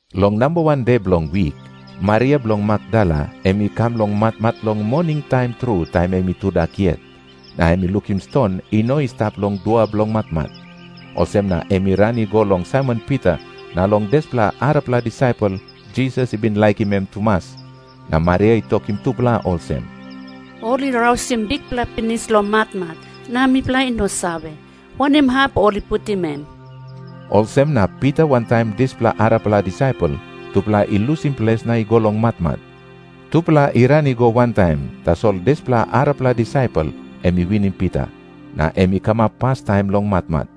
Long namba wan de bilong wik, Maria bilong Makdala em i kam long matmat long moningtaim tru, taim em i tudak yet. Na em i lukim ston i no i stap long dua bilong matmat. Olsem na em i ran i go long Saimon Pita na long dispela arapela disaipel, Jisas i bin laikim em tumas, na Maria i tokim tupela olsem, “Ol i rausim Bikpela pinis long matmat, na mipela i no save, wanem hap ol i putim em.” Olsem na Pita wantaim dispela arapela disaipel, tupela i lusim ples na i go long matmat. Tupela i ran i go wantaim, tasol dispela arapela disaipel em i winim Pita, na em i kamap pastaim long matmat.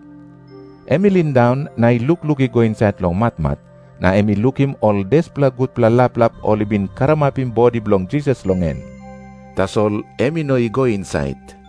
Em i lindaun na i lukluk i go insait long matmat, na em i lukim ol dispela gutpela laplap ol i bin karamapim bodi bilong Jisas long en. Tasol em i no i go insait.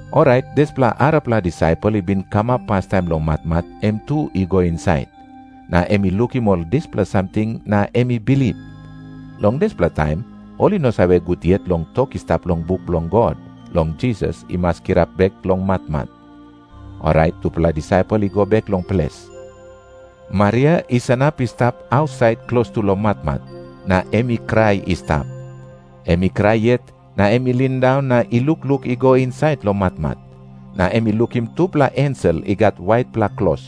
Orait dispela arapela disaipel i bin kamap pastaim long matmat, em tu i go insait. Na em i lukim ol dispela samting na em i bilip. Long dispela taim ol i no save gut yet long tok i stap long buk bilong God, long Jisas i mas kirap bek long matmat. Orait tupela disaipel i go bek long ples. Maria i sanap i stap ausait klostu long matmat, na em i krai i stap. Em i krai yet na em i lindaun na i lukluk i go insait long matmat. Na em i lukim tupela ensel i gat waitpela klos.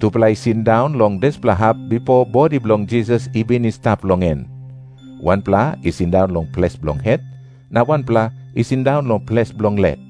Tupela i sindaun long dispela hap bipo bodi bilong Jisas i bin i stap long en. Wanpela i sindaun long ples bilong het, na wanpela i sindaun long ples bilong lek.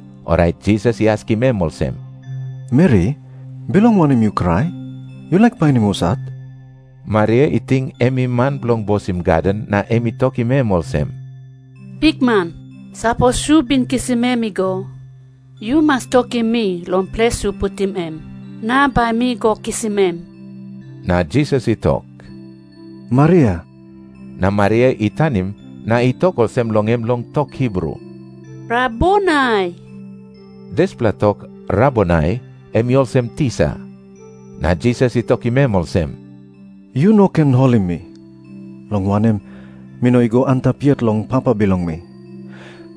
Orait Jisas i askim em olsem, “Meri, bilong wanem yu krai? Yu laik painim husat?” Maria i ting em i man bilong bosim gaden, na em i tokim em olsem, “Bikman, sapos yu bin kisim em i go, yu mas tokim mi long ples yu putim em, na bai mi go kisim em.” Na Jisas i tok, “Maria.” Na Maria i tanim na i tok olsem long em long tok Hibru, “Rabonai.” Dispela tok “Rabonai” em i olsem, “Tisa.” Na Jisas i tokim em olsem, “Yu no ken holim mi, long wanem, mi no i go antap yet long Papa bilong mi.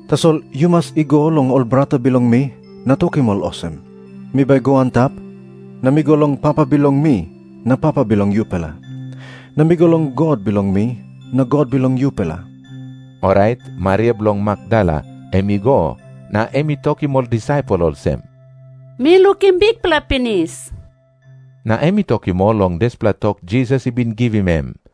Tasol yu mas i go long ol brata bilong mi na tokim ol olsem, mi bai go antap, na mi go long Papa bilong mi na Papa bilong yupela. Na mi go long God bilong mi na God bilong yupela.” Orait Maria bilong Makdala em i go, na em i tokim ol disaipel olsem, “Mi lukim Bikpela pinis.” Na em i tokim ol long dispela tok Jisas i bin givim em.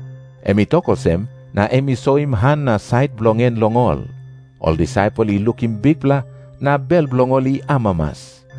Em i tok olsem, na em i soim han na sait bilong en long ol. Ol disaipel i lukim Bikpela, na bel bilong ol i amamas.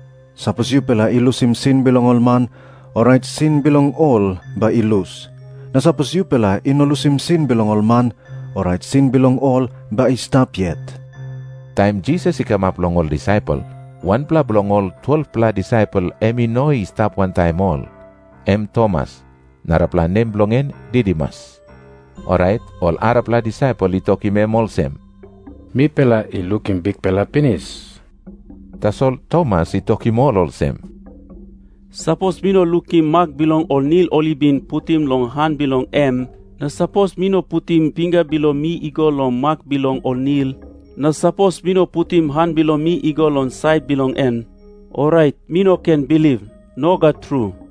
Sapos yupela i lusim sin bilong ol man, orait sin bilong ol bai i lus. Na sapos yupela i no lusim sin bilong ol man, orait sin bilong ol bai i stap yet.” Taim Jisas i kamap long ol disaipel, wanpela bilong ol 12-pela disaipel em i no i stap wantaim ol. Em Tomas, narapela nem bilong en Didimus. Orait ol arapela disaipel i tokim em olsem, “Mipela i lukim Bikpela pinis.” Tasol Tomas i tokim ol olsem, “Sapos mi no lukim mak bilong ol nil ol i bin putim long han bilong em, na sapos mi no putim pinga bilong mi i go long mak bilong ol nil, na sapos mi no putim han bilong mi i go long sait bilong en, orait mi no ken bilip. Nogat tru.”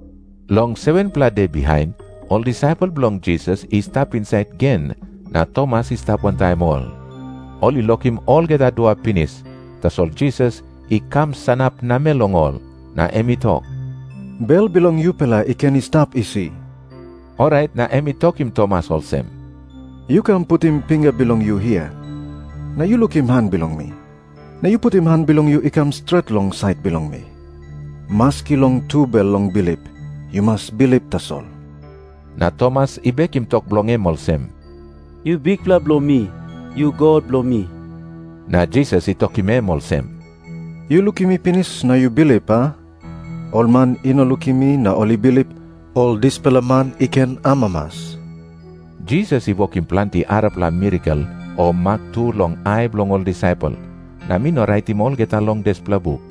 Long 7-pela de bihain, ol disaipel bilong Jisas i stap insait gen, na Tomas i stap wantaim ol. Ol i lokim olgeta dua pinis, tasol Jisas i kam sanap namel long ol. Na em i tok, “Bel bilong yupela i ken i stap isi.” Orait na em i tokim Tomas olsem, “Yu kam putim pinga bilong yu hia, na yu lukim han bilong mi. Na yu putim han bilong yu i kam stret long sait bilong mi. Maski long tubel long bilip. Yu mas bilip tasol.” Na Tomas i bekim tok bilong em olsem, “Yu Bikpela bilong mi. Yu God bilong mi.” Na Jisas i tokim em olsem, “Yu lukim mi pinis na yu bilip, a? Ol man i no lukim mi na ol i bilip, ol dispela man i ken amamas.” Jisas i wokim planti arapela mirakel o mak tu long ai bilong ol disaipel, na mi no raitim olgeta long dispela buk.